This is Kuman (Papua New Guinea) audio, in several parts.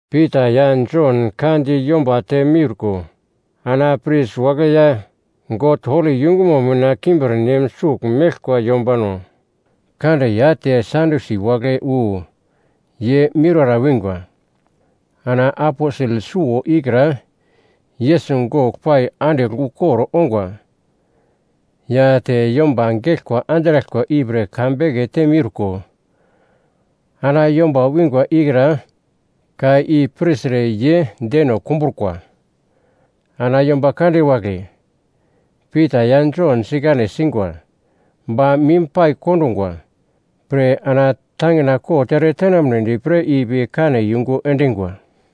Pita ya Jon ka di yomba te meurko ana pris wagle ya God holi yungumo mina kimbirnem sugl meglkwa yombano kande ya te Sadyusi wagle wu ye miurara wingwa. Ana aposel suwo ikra Yesus gogl pai andigl ukor ongwa ya te yomba geglkwa andraglkwa ipre ka bekete miurko, ana yomba wingwa ikra ka i pirtre ye deno kumbrukwa. Ana yomba kande wagle Pita ya Jon sikane singwa ba mim pai kondungwa pre ana tangina kot eretenamnedi pre ipi kane yungu endingwa.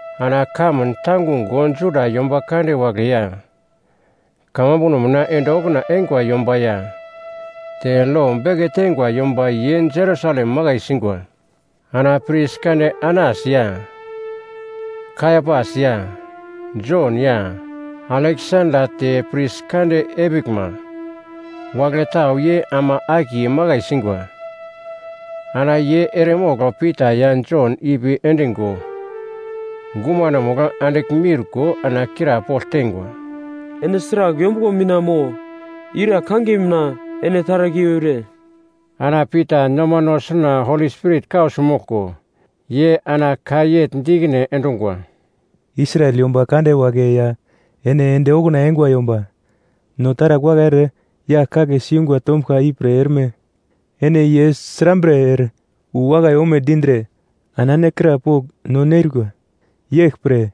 Ana kamun tangungo Juda yomba kande wagle ya, kamambuno mina ende okuna eingwa yomba ya, te lo beke teingwa yomba ye Jerusalem makai singwa. Ana pris kande Anas ya, Kaiapas ya, Jon ya, Aleksanda te pris kande epiglma wagle tau ye ama akiye makai singwa. Ana ye eremogl Pita ya Jon ipi endingo gumanomugl andigl miurko ana krapogl teingwa, “Ene sragl yombuglo mina mo ira kangiye mina ene taragl i eure?” Ana Pita nomano suna Holi Spirit kausi moglko, ye ana ka yegl di ikine endungwa, “Israel yomba kande wagle ya ene ende okuna eingwa yomba, no taragl wakai ere yagl kagle siyungwa tombuglka ipre erme ene ye srambre ere wu wakai ome dindre ana ene krapogl no nerikwa. Yeglpre,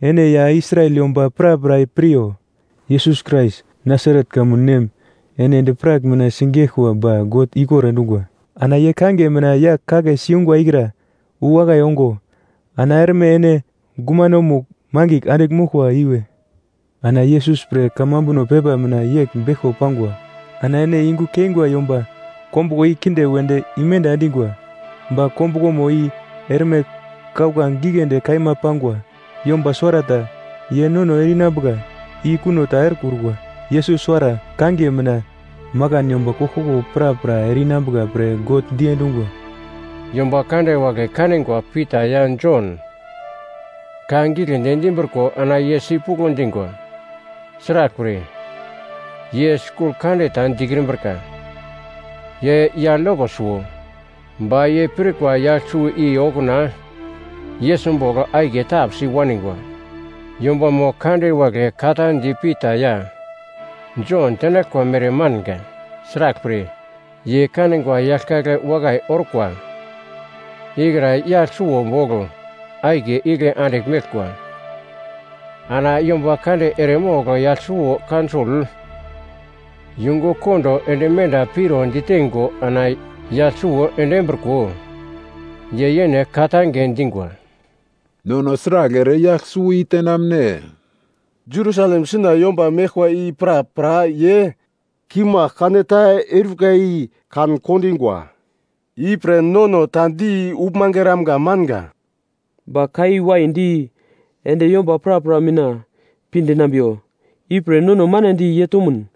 ene ya Israel yomba prapra piryo, Yesus Krais Nasaret kamun nem ene endi-prak mina sigeglkwa ba God ikor endungwa; ana ye kangiye mina yagl kagle siyungwa ikra wu wakai ongo, ana erme ene gumanomugl mangigl andigl moglkwa iwe. Ana Yesus pre kamambuno pepa mina yegl beglko pangwa, “‘Ana ene yungu keingwa yomba kombuglo i kinde wedi imenda endingwa, ba kombuglomo i erme kauglange giglendi kaima pangwa.’ Yomba suwarata ye nono ere-inambuka i kuno ta erekrukwa. Yesus suwara kangiye mina makan yomba koglkoglo prapra ere-inambuka pre God diendungwa.” Yomba kande wagle kanigwa Pita ya Jon ka giglendi dimbriko ana ye sipuglo dingwa. Sraglpre, ye skul kande ta dikrimbrika, ye yagl yoko suwo. Ba ye pirkwa yagl suwo i okuna Yesus bogl akiye tapsi waningwa. Yombamo kande wagle ka ta di Pita ya Jon tenaglkwa mere manga. Sraglpre, ye kanigwa yagl kagle wakai orkwa ikra yagl suwo bogl akiye igle andigl meglkwa. Ana yomba kande eremogl yagl suwo kaunsol yungu kondo ende menda piro diteingo ana yagl suwo endimbriko, ye yene ka-tange dingwa, “Nono sragl ere yagl suwo i tenamne? Jerusalem suna yomba meglkwa i prapra ye kimagl kaneta eurika i kan-kondingwa. Ipre nono ta di uglmange eramga manga. Ba ka i waidi ende yomba prapra mina pi dinambiwa, ipre nono manedi ye tomun,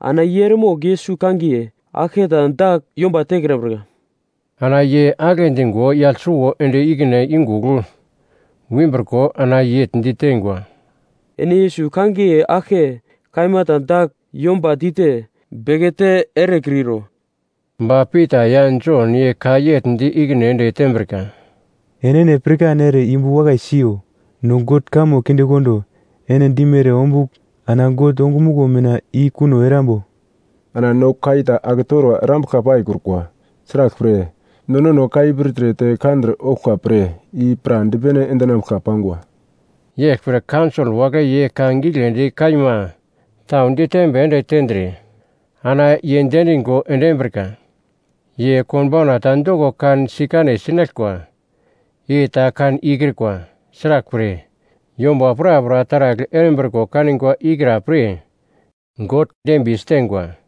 ana ye eremogl Yesus kangiye aglketa dagl yomba tekrambrika.” Ana ye agle dingo yagl suwo ende ikine yungugl wimbriko ana yegl diteingwa, “Ene Yesus kangiye aglke kaima ta dagl yomba dite bekete erekritro.” Ba Pita ya Jon ye ka yegl di ikine ende tembrika, “Enene pirkan ere yumbu wakai siyo, no God kamo kindekondo, ene dimere ombugl ana God ongumuglo mina i kuno erambo? Ana no ka i ta aketorwa erambuglka paikrukwa. Sraglpre, no nono ka i pirtre te kandre ouglka pre i pradipene endinambuglka pangwa.” Yeglpre kaunsol wagle ye ka giglendi kaima tau ditembi ende tendre ana ye diendingo endimbrika. Ye konbauna ta doko kan sikane sinaglkwa i ta kan ikrikwa, sraglpre, yomba prapra taragl erimbriko kanigwa ikra-pre God dembiye siteingwa.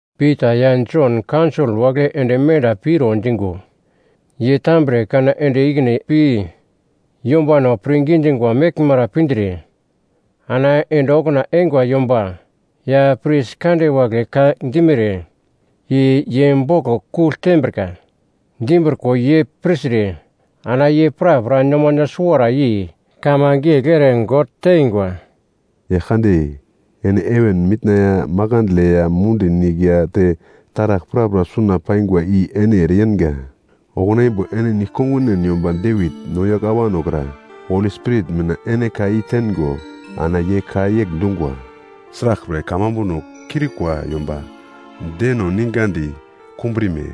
Pita ya Jon kaunsol wagle ende menda piro dingo, ye tambre kana ende ikine pi yombano pirngi dingwa meglmara pindre ana ende okuna eingwa yomba ya pris kande wagle ka dimere i ye boglo kugl ditembrika. Dimbriko ye pirtre ana ye prapra nomano suwara yei kamange yegl ere God teingwa, “Yaglkande, ene heven mitna ya makandle ya mundi nigl ya te taragl prapra suna paingwa i ene ereyenga. Okuna imbo ene nigl kongunen yomba Devit, no yagl awano kra, Holi Spirit mina ene ka i teingo ana ye ka yegl dungwa, “‘Sraglpre kamambuno kiurikwa yomba deno ningadi kumbrime?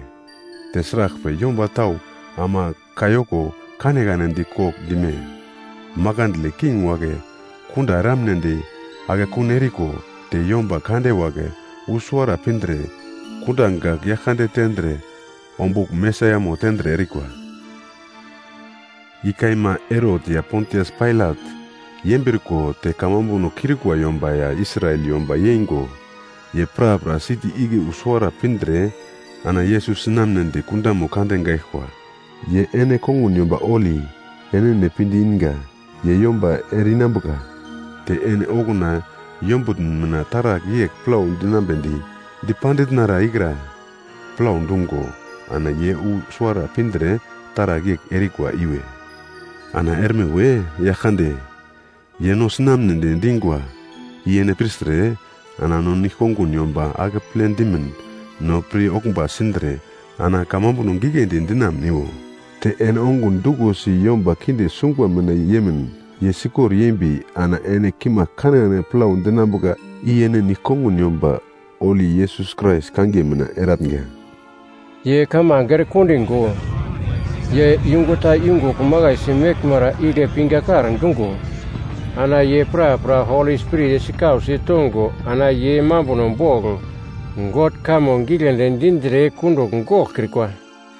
Te sraglpre yomba tau ama kayoko kanekane di kogl dime? Makandle king wagle kunda eramnedi akekun eriko, te yomba kande wagle wu suwara pindre kunda gagl Yaglkande tendre ombugl Mesaiamo tendre erikwa.’ I kaima, Herot ya Pontias Pailat yembriko te kamambuno kiurikwa yomba ya Israel yomba yeingo, ye prapra siti igle wu suwara pindre ana Yesus sinamnedi kundamo kande gaglkwa, ye ene kongun yomba holi, enene pinde inga, ye yomba ere-inambuka. Te ene okuna yombutn mina taragl yegl plau dinambedi dipanditnara ikra plau dungo ana ye wu suwara pindre taragl yegl erikwa iwe. “Ana erme we, Yaglkande, ye no sinamne dingwa i ene pirtre ana no nigl-kongun yomba akeple dimin no pir-oglmba sindre ana kamambuno giglendi dinamuniwo. Te ene ongun duglo si yomba kinde sungwa mina yemin ye sikor yembi ana ene kimagl kanekane plau dinambuka i ene nigl-kongun yomba holi Yesus Krais kangiye mina eratnga.” Ye kamange erekondingo, ye yungu ta yungugl makaisi meglmara igle pingakar dungo, ana ye prapra Holi Spirit sikausi tongo ana ye mambuno bogl God kamo giglendi dindre kundugl goglkrikwa.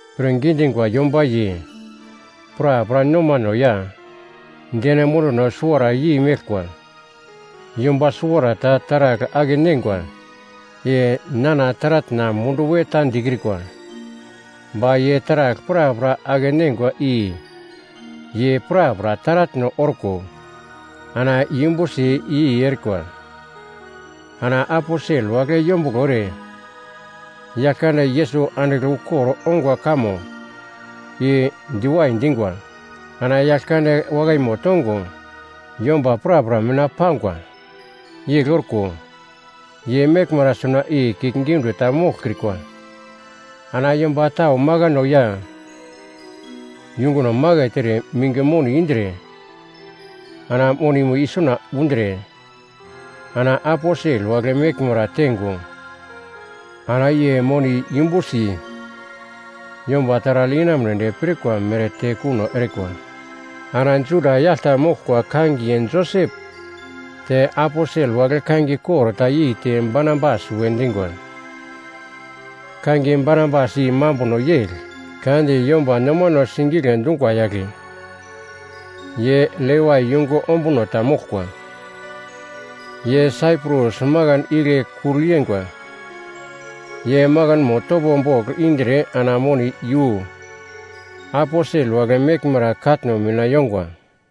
Pirngi dingwa yomba ye prapra nomano ya deno munduno suwara yei meglkwa. Yomba suwarata taragl ake-neingwa, i nana taratna mundu we ta dikrikwa. Ba ye taragl prapra ake-neingwa i ye prapra taratno orko, ana yumbusi i-i erikwa. Ana aposel wagle yombuglo ere Yaglkande Yesus andigl ukor ongwa kamo i diwai dingwa. Ana Yaglkande wakaimo tongo yomba prapra mina pangwa. Yegl orko, ye meglmara suna i kiuglgiunde ta moglkrikwa. Ana yomba tau makano ya yunguno maket ere minge moni indre ana monimo isuna undre, ana aposel wagle meglmara teingo, ana ye moni i yumbusi yomba taragl inamunedi pirkwa mere tekuno erikwa. Ana Juda yagl ta moglkwa kangiye Josep te aposel wagle kangiye kor ta yeite Barnabas we dingwa (kangiye Barnabas i mambuno yegl, ‘Ka di yomba nomano sigigle dungwa yagle.’) Ye Levai yungu ombuno ta moglkwa. Ye Saiprus makan igle kugl yeingwa. Ye makanmo topo bogl indre ana moni iyu aposel wagle meglmara katno mina yongwa.